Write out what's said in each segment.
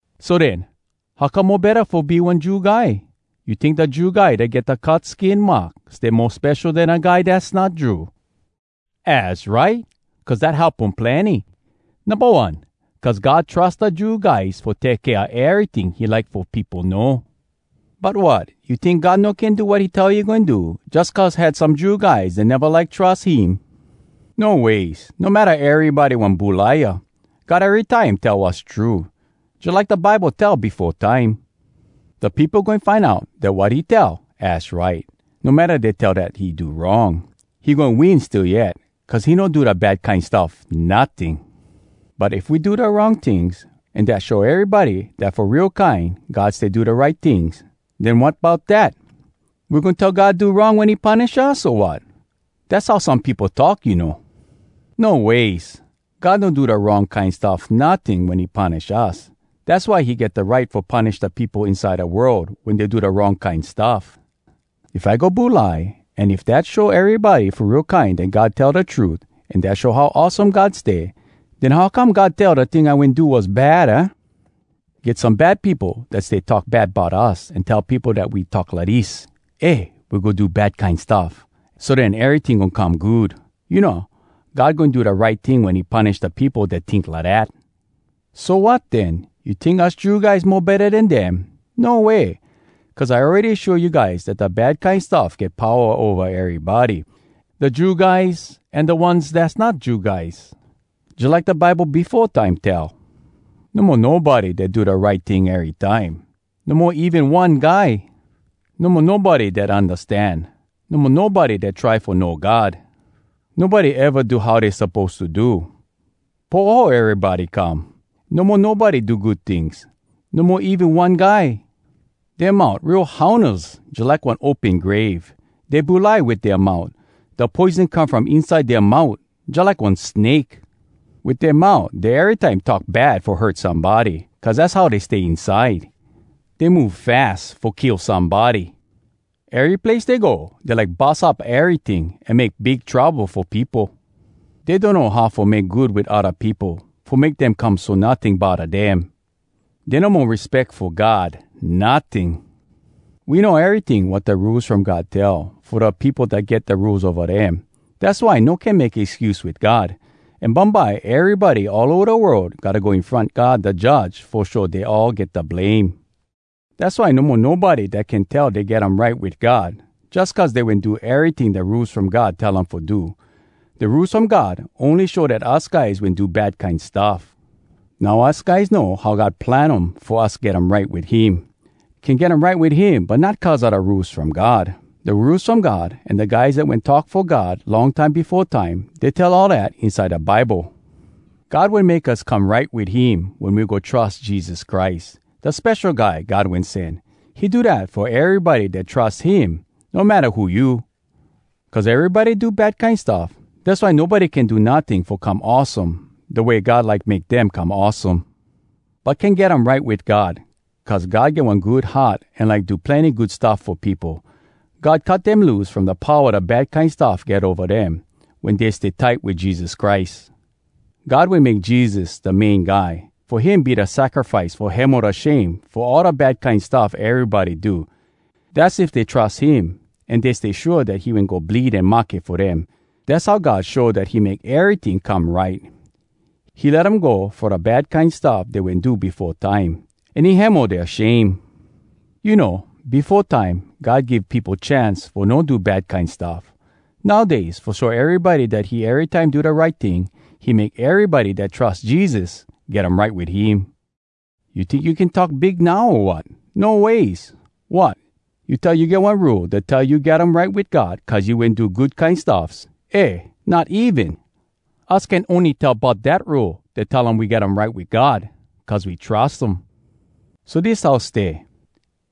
So den, how come mo betta fo be one Jew guy? You tink da Jew guy dat get da cut skin mark stay mo spesho den da guy dass not Jew? Az right! Cuz dat help um plenny. Numba one, cuz God trus da Jew guys fo take kea eryting he like fo peopo know. But wat? You tink God no can do wat he tell he goin do, jus cuz had some Jew guys dat neva like trus him? No ways! No matta erybody one bulaia, God erytime tell wass true! Jalike da Bible tell befo time, “Da peopo goin find out Dat wat he tell, az right. No matta dey tell dat he do wrong, He goin win still yet, Cuz he no do da bad kine stuff notting.” But if we do da wrong tings, an dat show erybody dat fo real kine God stay do da right tings, den wat bout dat? We goin tell God do wrong wen he punish us, o wat? (Dass how some peopo talk, you know.) No ways! God no do da wrong kine stuff notting wen he punish us. Dass why he get da right fo punish da peopo inside da world wen dey do da wrong kine stuff. If I go bulai, an if dat show erybody fo real kine dat God tell da trut, an dat show how awesome God stay, den how come God tell da ting I wen do was bad, aah? Get some bad peopo dat stay talk bad bout us an tell peopo dat we talk lidis: “Eh, we go do bad kine stuff, so den eryting goin come good!” You know, God goin do da right ting wen he punish da peopo dat tink lidat! So wat, den? You tink us Jew guys mo betta den dem? No way! Cuz I awready show you guys dat da bad kine stuff get powa ova erybody, da Jew guys an da ones dass not Jew guys. Jalike da Bible befo time tell, “No mo nobody dat do da right ting erytime. No mo even one guy! No mo nobody dat undastan, No mo nobody dat try fo know God! Nobody eva do how dey suppose to do. Poho, erybody come! No mo nobody do good tings, No mo even one guy! Dea mout real haunas jalike one open grave. Dey bulai wit dea mout. Da poison come from inside dea mout, Jalike one snake. Wit dea mout Dey erytime talk bad fo hurt somebody, Cuz az how dey stay inside. Dey move fas Fo kill somebody. Ery place dey go, Dey like bus up eryting, An make big trouble fo peopo. Dey donno how fo make good wit odda peopo, Fo make dem come so notting bodda dem. Dey no mo respeck fo God notting.” We know eryting wat da Rules From God tell, fo da peopo dat get da Rules ova dem. Dass why no can make excuse wit God. An bumbye erybody all ova da world gotta go in front God da Judge fo show dey all get da blame. Dass why no mo nobody dat can tell dat dey get um right wit God, jus cuz dey wen do eryting da Rules From God tell um fo do. Da Rules From God ony show dat us guys wen do bad kine stuff. Now us guys know how God plan um fo us get um right wit him. Can get um right wit him, but not cuz a da Rules From God. Da Rules From God an da guys dat wen talk fo God long time befo time, dey tell all dat inside da Bible. God wen make us come right wit him wen we go trus Jesus Christ, da Spesho Guy God Wen Sen. He do dat fo erybody dat trus him, no matta who you. Cuz erybody do bad kine stuff, dass why nobody can do notting fo come awesome da way God like make dem come awesome. But can get um right wit God, cuz God get one good heart an like do plenny good stuff fo peopo. God cut dem loose from da powa da bad kine stuff get ova dem, wen dey stay tight wit Jesus Christ. God wen make Jesus da main guy, fo him be da sacrifice fo hemo da shame fo all da bad kine stuff erybody do. Dass if dey trus him an dey stay shua dat he wen go bleed an mahke fo dem. Dass how God show dat he make eryting come right: he let um go fo da bad kine stuff dey wen do befo time, an he hemo dea shame. You know, befo time God give peopo chance fo no do bad kine stuff. Nowdays, fo show erybody dat he erytime do da right ting, he make erybody dat trus Jesus get um right wit him. You tink you can talk big now, o wat? No ways! Wot?! You tell you get one Rule dat tell you get um right wit God cuz you wen do good kine stuffs? Eh, not even! Us can ony tell bout dat Rule dat tell we get um right wit God cuz we trus um. So dis how stay: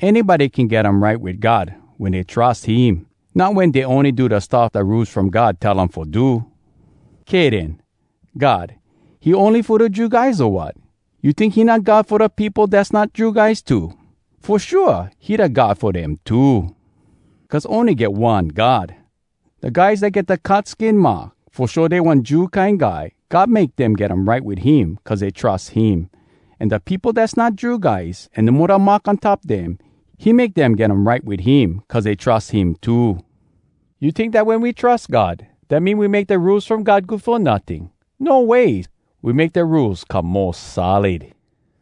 Anybody can get um right wit God wen dey trus him, not wen dey ony do da stuff da Rules From God tell um fo do. Kay den. God, he ony fo da Jew guys, o wat? You tink he not God fo da peopo dass not Jew guys too? Fo shua, he da God fo dem too! Cuz ony get one God. Da guys dat get da cut skin mark fo show dey one Jew kine guy, God make dem get um right wit him cuz dey trus him. An da peopo dass not Jew guys an no mo da mark on top dem, he make dem get um right wit him cuz dey trus him too. You tink dat wen we trus God, dat mean we make da Rules From God good fo notting? No ways! We make da Rules come mo solid.